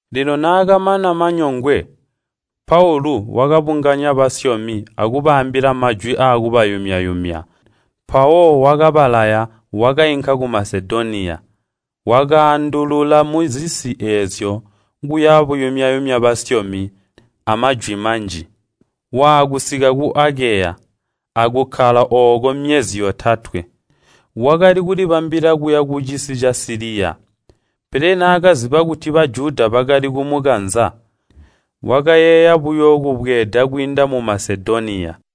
Lino naakamana manyongwe, Paulu wakabunganya basyomi akubaambila majwi aakubayumya-yumya. Mpawo wakabalaya wakainka ku Masedoniya. Wakaandulula muzisi eezyo kuya buyumya-yumya basyomi amajwi manji. Waakusika ku Akeya, akukkala ooko myezi yotatwe. Wakali kulibambila kuya kucisi ca Siliya, pele naakaziba kuti Bajuda bakali kumukanza, wakayeeya buyo kubweeda kwiinda mu Masedoniya.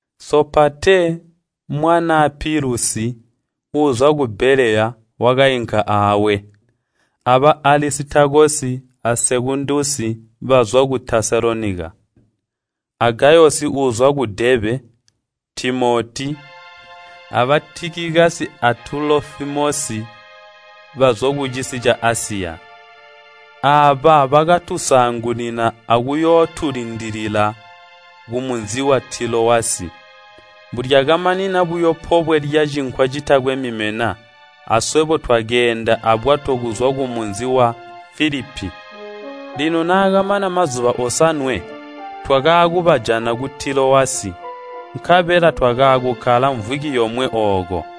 Sopatee, mwanaa Pilusi, uuzwa ka Beleya, wakainka aawe, aba Alisitakosi a Sekundusi bazwa ku Tesalonika, a Gayosi uuzwa ku Deebe, Timoti, aba Tikikasi a Tulofimosi bazwa kucisi ca Asiya. Aaba bakatusaangunina akuyootulindilila kumunzi wa Tilowasi. Mbulyakamanina buyo pobwe lya Cinkwa Citakwe Mimena, aswebo twakeenda abwato kuzwa kumunzi wa Filipi. Lino naakamana mazuba osanwe, twakaakubajana ku Tilowasi, nkabela twakaakukkala mvwiki yomwe ooko.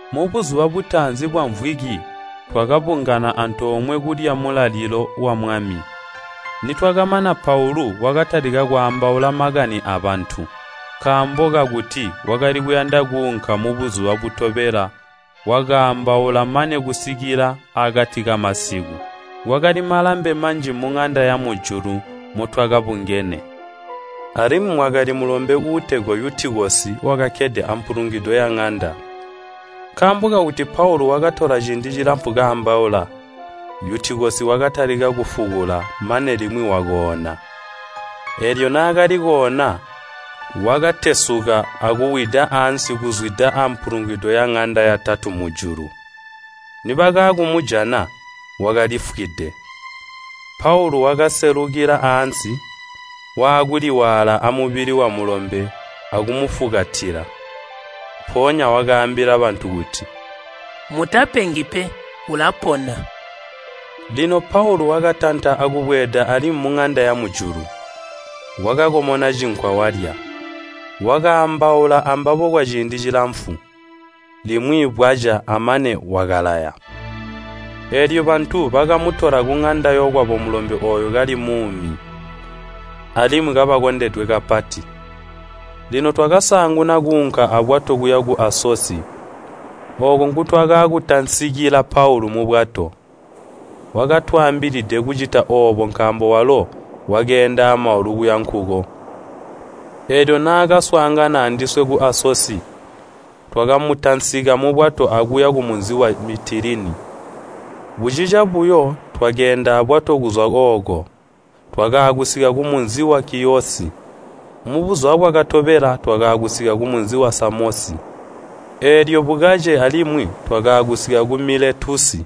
Mubuzuba butaanzi bwamvwiki twakabungana antoomwe kulya mulalilo wa Mwami. Nitwakamana Paulu wakatalika kwaambaula makani abantu. Nkaambo kakuti wakali kuyanda kuunka mubuzuba butobela wakaambaula mane kusika akati kamasiku. Kwakali malambe manji muŋanda yamujulu motwakabungene. Alimwi mwakali mulombe uutegwa Yutikosi wakakkede ampulungwido yaŋanda. Nkaambo kakuti Paulu wakatola ciindi cilamfu kaambaula, Yutikosi wakatalika kufukula mane limwi wakoona. Eelyo naakali koona wakatesuka akuwida ansi kuzwida ampulungwido yaŋanda yatatu mujulu. Nibakaakumujana, wakalifwide. Paulu wakaselukila ansi, waakuliwaala amubili wamulombe akumufukatila. Mpoonya wakaambila bantu kuti, “Mutapengi pe, ulapona!” Lino Paulu wakatanta akubweeda alimwi muŋanda yamujulu. Wakakomona cinkwa walya. Wakaambaula ambabo kwaciindi cilamfu, limwi bwaca, amane wakalaya. Eelyo bantu bakamutola kuŋanda yokwabo mulombe ooyo kali muumi, alimwi kabakondedwe kapati. Lino twakasaanguna kuunka abwato kuya ku Asosi, ooko nkutwakaakutansikila Paulu mubwato. Wakatwaambilide kucita oobo nkaambo walo wakeenda amaulu kuya nkuko. Eelyo naakaswaangana andiswe ku Asosi, twakamutansika mubwato akuya kumunzi wa Mitiline. Bucica buyo twakeenda abwato kuzwa ooko, twakaakusika ku munzi wa Kiyosi. Mubuzuba bwakatobela twakaakusika kumunzi wa Samosi, eelyo bukace alimwi twakaakusika ku Miletusi.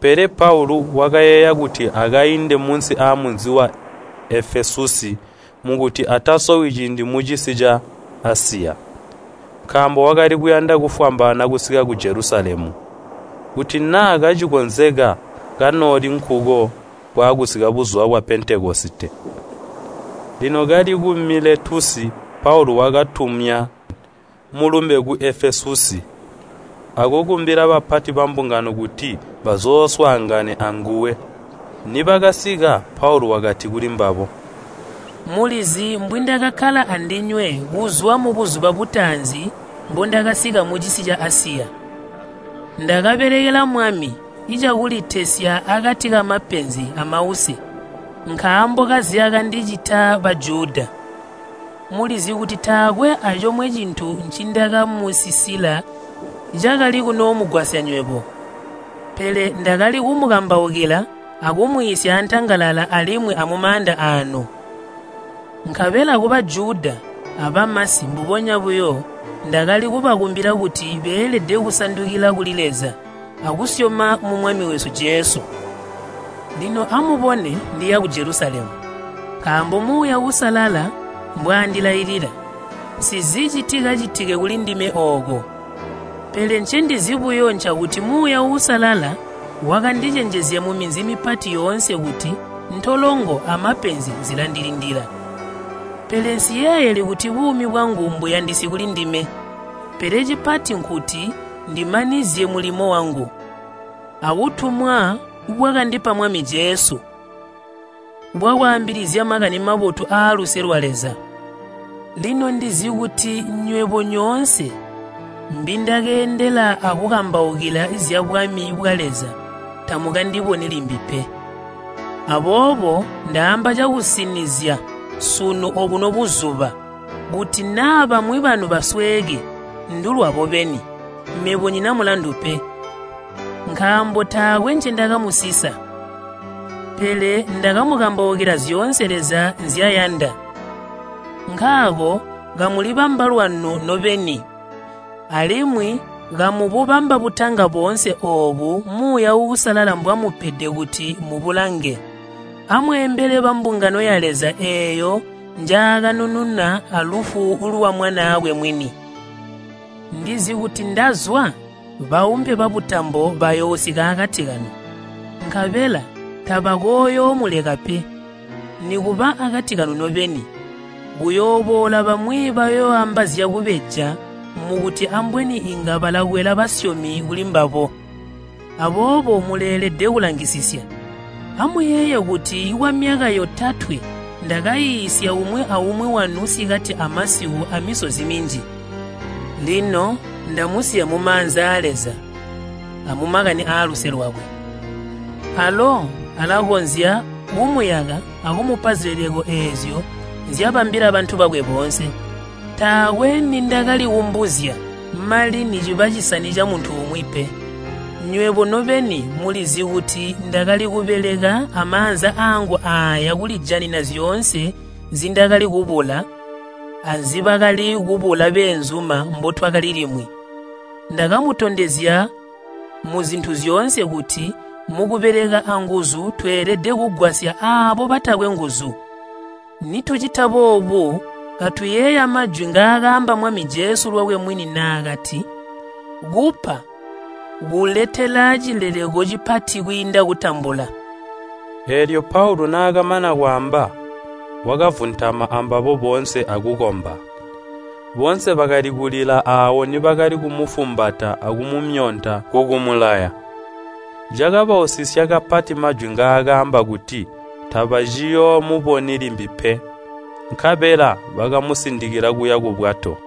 Pele Paulu wakayeeya kuti akainde munsi amunzi wa Efesusi mukuti atasowi ciindi mucisi ca Asiya. Nkaambo wakali kuyanda kufwambaana kusika ku Jelusalemu, kuti naa kacikonzeka kanooli nkuko bwaakusika buzuba bwa Pentekosite. Lino kali ku Miletusi Paulu wakatumya mulumbe ku Efesusi, akukumbila bapati bambungano kuti bazooswaangane anguwe. Nibakasika, Paulu wakati kulimbabo, “Mulizi mbwindakakkala andinywe kuzwa mubuzuba butaanzi mbondakasika mucisi ca Asiya. Ndakabelekela Mwami cakulitesya akati kamapenzi amause nkaambo kazyakandicita Bajuda. Mulizi kuti taakwe acomwe cintu ncindakamusisila cakali kunoomugwasya nywebo, pele ndakali kumukambaukila akumwiisya antangalala alimwi amumaanda aanu. Nkabela ku Bajuda abamasi mbubonya buyo, ndakali kubakumbila kuti beelede kusandukila kuli Leza, akusyoma mu Mwami wesu Jesu. “Lino amubone ndiya ku Jelusalemu, nkaambo Muuya Uusalala mbwaandilailila. Nsizi citikacitike kulindime ooko. Pele ncendizi buyo ncakuti Muuya Uusalala wakandicenjezya muminzi mipati yoonse kuti ntolongo amapenzi zilandilindila. Pele nsiyeeyeli kuti buumi bwangu mbuyandisi kulindime, pele cipati nkuti ndimanizye mulimo wangu, abutumwa bwakandipa Mwami Jesu, bwakwaambilizya Makani Mabotu aaluse lwa Leza. “Lino ndizi kuti nywebo nyoonse mbindakeendela akukambaukila zyabwami bwa Leza tamukandiboni limbi pe. Aboobo ndaamba cakusinizya sunu obuno buzuba, kuti naa bamwi banu basweeke, ndulwabo beni, mebo nyina mulandu pe. Nkaambo taakwe ncindakamusisa, pele ndakamukambaukila zyoonse Leza nzyayanda. Nkaako kamulibamba lwanu nobeni, alimwi kamububamba butanga boonse oobo Muuya Uusalala mbwamupede kuti mubulange. Amweembele bambungano ya Leza eeyo njaakanununa alufu lwa Mwanaakwe mwini. Ndizi kuti ndazwa, baumpe babutambo, bayoosika akati kanu, nkabela tabakooyomuleka pe. Nikuba akati kanu nobeni, kuyooboola bamwi bayoooamba zyakubeja mukuti ambweni inga balakwela basyomi kulimbabo. Aboobo muleelede kulangisisya. Amuyeeye kuti kwamyaka yotatwe ndakaiisya umwi aumwi wanu sikati amasiku amisozi minji. “Lino ndamusiya mumaanza aa Leza amumakani aaluse lwakwe. Alo alakonzya kumuyaka akumupa zileleko eezyo nzyabambila bantu bakwe boonse. Taakwe nindakalikumbuzya mali niciba cisani camuntu umwi pe. Nywebo nobeni mulizi kuti ndakali kubeleka amaanza aangu aaya kulijanina zyoonse nzindakalikubula anzibakali kubula beenzuma mbotwakali limwi. Ndakamutondezya muzintu zyoonse kuti mukubeleka anguzu tweelede kugwasya aabo batakwe nguzu. Nitucita boobu katuyeeya majwi ngaakaamba Mwami Jesu lwakwe mwini naakati, ‘Kupa kuletela cileleko cipati kwiinda kutambula.’” Eelyo Paulu naakamana kwaamba, wakavuntama ambabo boonse akukomba. Boonse bakali kulila aawo nibakali kumufumbata akumumyonta kukumulaya. Cakabausisya kapati mmajwi ngaakaamba kuti tabaciyoomuboni limbi pe. Nkabela bakamusindikila kuya kubwato.